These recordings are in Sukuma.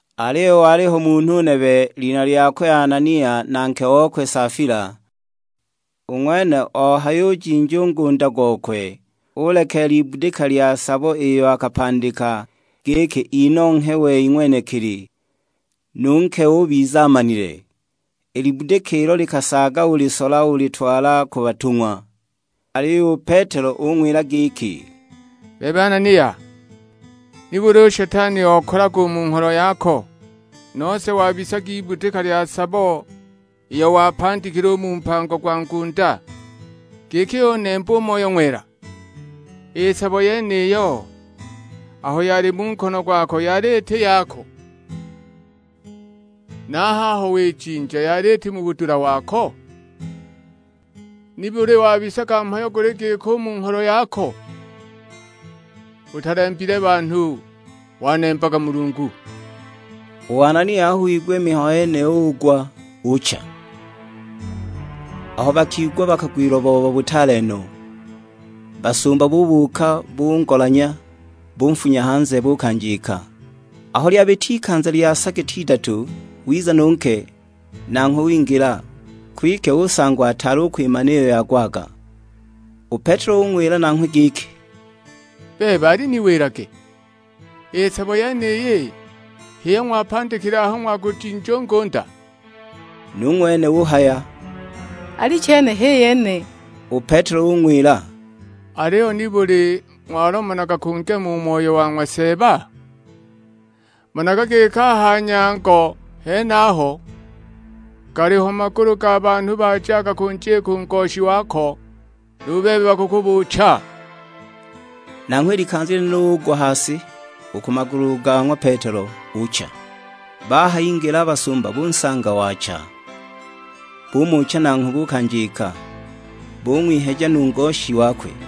Aliyo waliho munhu nebe, lina lyakwe Anania na nke okwe Safila; u ng'wene ohayujinja u ngunda gokwe, ulekeela ibudika lya sabo iyo akapandika, giki inonghe wei ng'wenekili, nu nke ubiza amanile! I libudika ilo likasaaga ulisola ulitwala ku batung'wa. Aliyo u Petelo ung'wila giki, "Bebe Anania, nibuli u Shetani okalaga u mu ngholo yako, nose wabisaga ibudika lya sabo iyo wapandikile u mu mpango gwa ngunda, giki unembe u Moyo Ng'wela? I sabo yeniyo, aho yali mu nkono gwako yali iti yako? Na a haho wijinja yali iti mu budula wako? Nibuli wabisaga mhayo guli giko u mu ngholo yako? Utalembile banhu, wanembaga Mulungu!" U Anania aho wigwa i mihayo yeniyo ugwa, ucha! Abo bakigwa bakagwilwa booba butaale no. Basumba bubuuka bungolanya, bunfunya hanze, buukanjika. Aho lyabita ikanza lya sa giti idatu, wiza nu nke, nanghwe wingila; kwike usangwa ataali u kwimana iyo yagwaga. U Petelo ung'wila nanghwe giki, "Bebe aliniwilage, i sabo yeniyi, h'iyo ng'wapandikile aho ng'wagujinja u ngunda?" Nu ng'wene uhaya, "Alichene, h'i yene!" U Petelo ung'wila, "Aliyo nibuli ng'walomanaga kungema u Moyo wa ng'wa Seeba? Managa giki a ha nyango henaho, galiho magulu ga banhu bajaga kunjika u ngoshi wako, nu bebe bakukubuucha!" Nanghwe i likanza lyenilo ugwa ha si u ku magulu ga ng'wa Petelo, ucha! Bahayingila a basumba bunsanga waacha; bumucha nanghwe buukanjika, bung'wiheja nu ngoshi wakwe.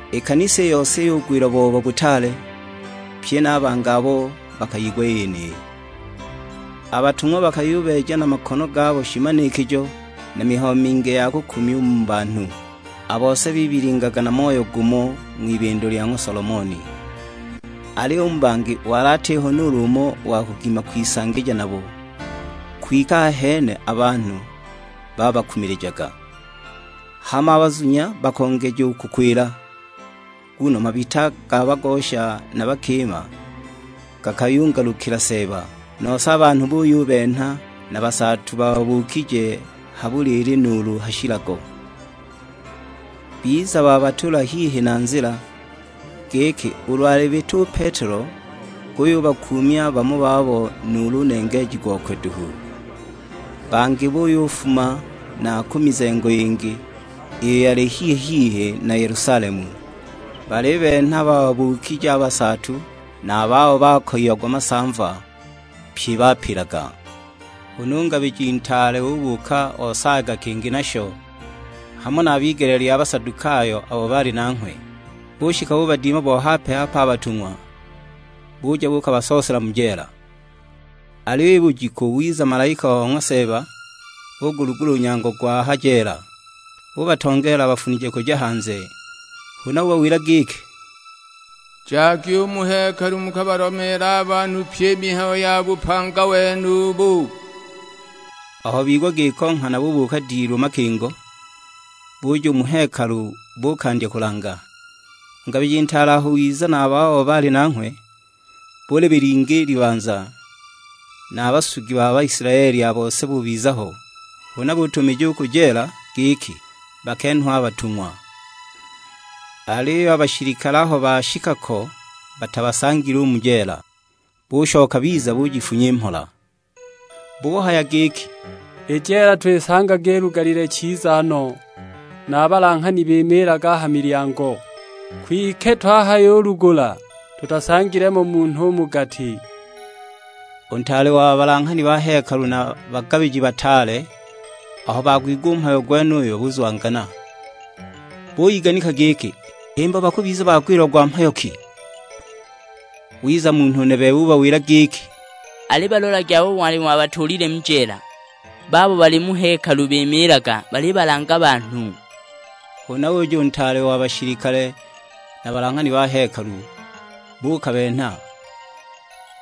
I kanisa i yose yugwilwa booba butaale, pye na a bangi abo bakayigwa i yeniyi! A batung'wa bakayubeeja na makono gabo shimanikijo na mihayo mingi ya kukumya u mu banhu; a bose bibilingaga na moyo gumo ng'wibindo lya ng'wa Solomoni. Aliyo u mu bangi wali atiho nuulu umo wa kugima kwisangija nabo; kwike ahene a banhu babakumilijaga. Hama a bazunya bakongeja u kukwila; nguno mabita ga bagosha na bakima gakayungalukila Seeba. Nose a banhu buyubenha na basaatu bababuukije ha buliili nuulu ha shilago, biza babatuula hihi na nzila, giki ulu alibita u Petelo guyubakuumya bamo babo nuulu nengeeji gokwe duhu. Bangi buyufuma na ku mizengo yingi, iyo yali hihi-hihi na Yelusalemu, balibenha bababuukije a basaatu na a babo bakoyiagwa masamva; pye bapilaga. Huna u ngabiji ntaale ubuuka osaayaga kingi nasho, hamo na a b'igele lya Basadukayo abo baali nanghwe. Bushika bubadima bo hape-hape a batung'wa, buja buukabasoosela mu jeela. Aliyo i bujiku wiza malaika o ng'wa Seeba, ugulugula u nyango gwa ha jeela. Ubatongeela abafunije kuja hanze, huna ubawila giki, "Jagi u mu hekalu mukabalomeele a banhu pyi i mihayo ya bupanga wenubu." Aho bigwa giko nghana bubuuka dilu makingo, buja u mu hekalu buukandya kulanga. U ngabiji ntaale aho wiza na a babo baali nanghwe, bulibilinga i libanza, na a basugi ba Baisilaeli a bose bubiza ho; huna butumija u ku jeela giki bakenhwe a batung'wa. Aliyo a bashilikale aho bashika ko batabasangile u mu jeela, bushoka biza bujifunya i mhola. Buhaya giki, "I jeela twisanga ilugalile chiza no, na a balanghani bimiilaga a ha milyango, kwike twahayulugula tutasangile mo munhu u mu gati!" U ntaale wa balanghani ba hekalu na a bagabiji bataale aho bagwigwa u mhayo gwenuyo buzwangana, buyiganika giki himba bakubiza bagwilagwa mhayo ki! Wiza munhu nebe ubawila giki, "Alibalolagi abo ng'wali ng'wabatuulile mu jeela, babo bali mu hekalu bimiilaga balibalanga banhu!" Huna uja u ntaale wa bashilikale na balanghani ba hekalu, buukabenha;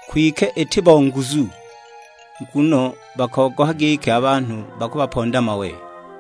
kwike iti bo nguzu, nguno bakogoha giki a banhu bakubaponda mawe.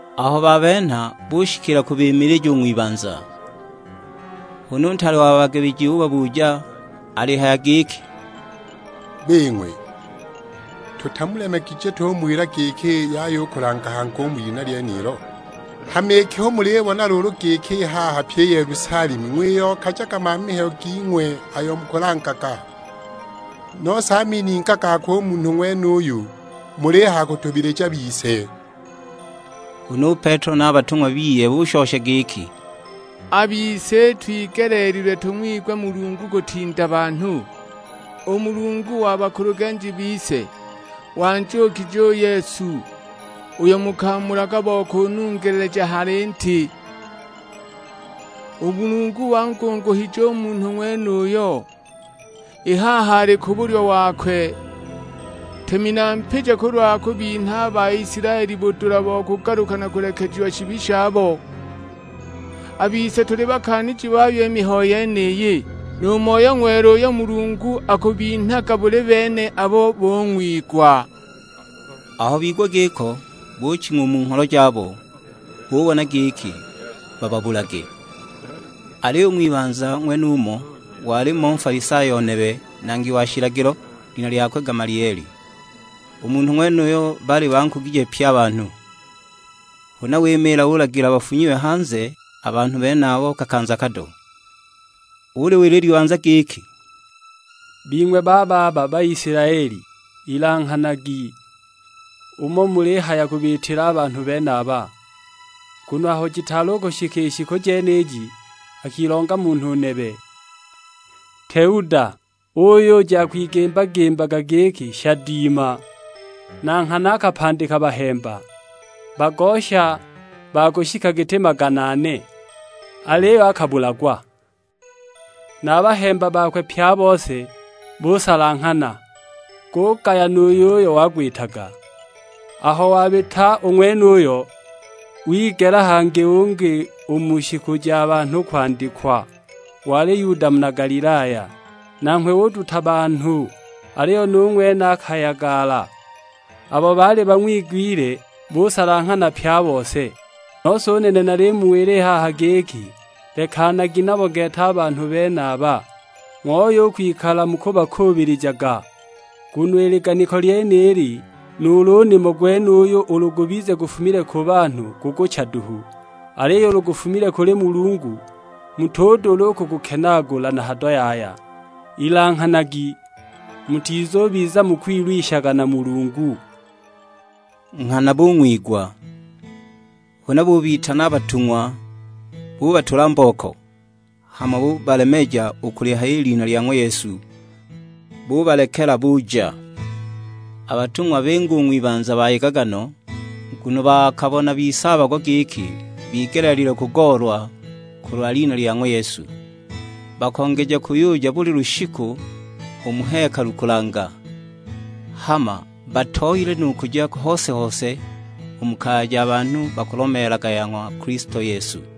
Aho babenha, bushikila kubimilija u ng'wibanza. Huna u ntaale wa bagabiji ubabuja alihaya giki, "Bing'we, tutamulemegije tumuwila giki yaya u kulanga hangi u mu lina lyenilo? Hama iki hu mulibona luulu giki i haha pyi i Yelusalemu ng'wiyokajaga mamihayo ging'we ayo mukulangaga, nose a mininga gakwe u munhu ng'wenuyo mulihaya kutubilija bise!" Huna u Petelo na a batung'wa biye bushosha giki, "A bise itwigeleelilwe tung'wigwe Mulungu kutinda banhu. U Mulungu wa bakulugenji bise wanjuukije u Yesu uyo mukamulaga bo kunungeleja ha linti. U Mulungu wangunguhije u Munhu ng'wenuyo, i haha ali ku bulyo wakwe, Ntemi na Mpija kulwa kubinha a Baisilaeli budula bo kugaluka na kulekejiwa shibi shabo. A bise tuli bakaaniji bayo i mihayo yeniyi, nu Moyo Ng'wela uyo Mulungu akubinhaga buli bene abo bung'wigwa." Aho bigwa giko, buching'wa u mu ngholo jabo, bubona giki bababulage. Aliyo u ng'wibanza ng'wenumo walimo Nfalisayo nebe, nangi wa shilagilo, lina lyakwe Gamalieli. U munhu ng'wenuyo baali bankugije pye a banhu. Huna wimiila ulagila bafunyiwe hanze a banhu benabo kakanza kado. Uliwila i libanza giki, "Bing'we bababa Baisilaeli, ilanghanagi umo mulihaya kubiitila a banhu benaba. Nguno aho jitaali u kushika i shiku jeniji, akilonga munhu nebe; Teuda, uyuja akwigimba-gimbaga giki shadiima. Na nghana akapandika bahemba: bagosha ba kushika giti magana ane; aliyo akabulagwa, na a bahemba bakwe pye a bose busalanghana, gugaya nu yuyo wagwitaga. Aho wabita u ng'wenuyo, wigela hangi ungi u mu shiku ja banhu kwandikwa; wali Yuda muna Galilaya. Nanghwe uduta banhu, aliyo nu ng'wene akayagala, abo baali bang'wigwile busalanghana pye a bose. Nose u nene nalimuwila i haha giki, lekanagi nabo gete a banhu benaba, ng'ooye u kwikala mukubakuubilijaga. Nguno i liganiko lyenili nuulu u nimo gwenuyu ulu gubize gufumile ku banhu gukucha duhu. Aliyo ulu gufumile kuli Mulungu, mutudula u kugukenaagula na hado yaya; ilanghanagi mutizubiza mukwilwishaga na Mulungu!" Nghana bung'wigwa. Huna bubitana a batung'wa, bubatula mbooko; hama bubalemeja u kulihaya i lina lya ng'wa Yesu, bubalekela buja. A batung'wa binga u ng'wibanza bayegaga no, nguno bakabona bisaabagwa giki bigeleelilwe kugoolwa kulwa lina lya ng'wa Yesu. Bakongeja kuyuja buli lushiku u mu hekalu kulanga, hama batooyile nu kuja hose-hose u mu kaya ja banhu bakulomeelaga ya ng'wa Kilisto Yesu.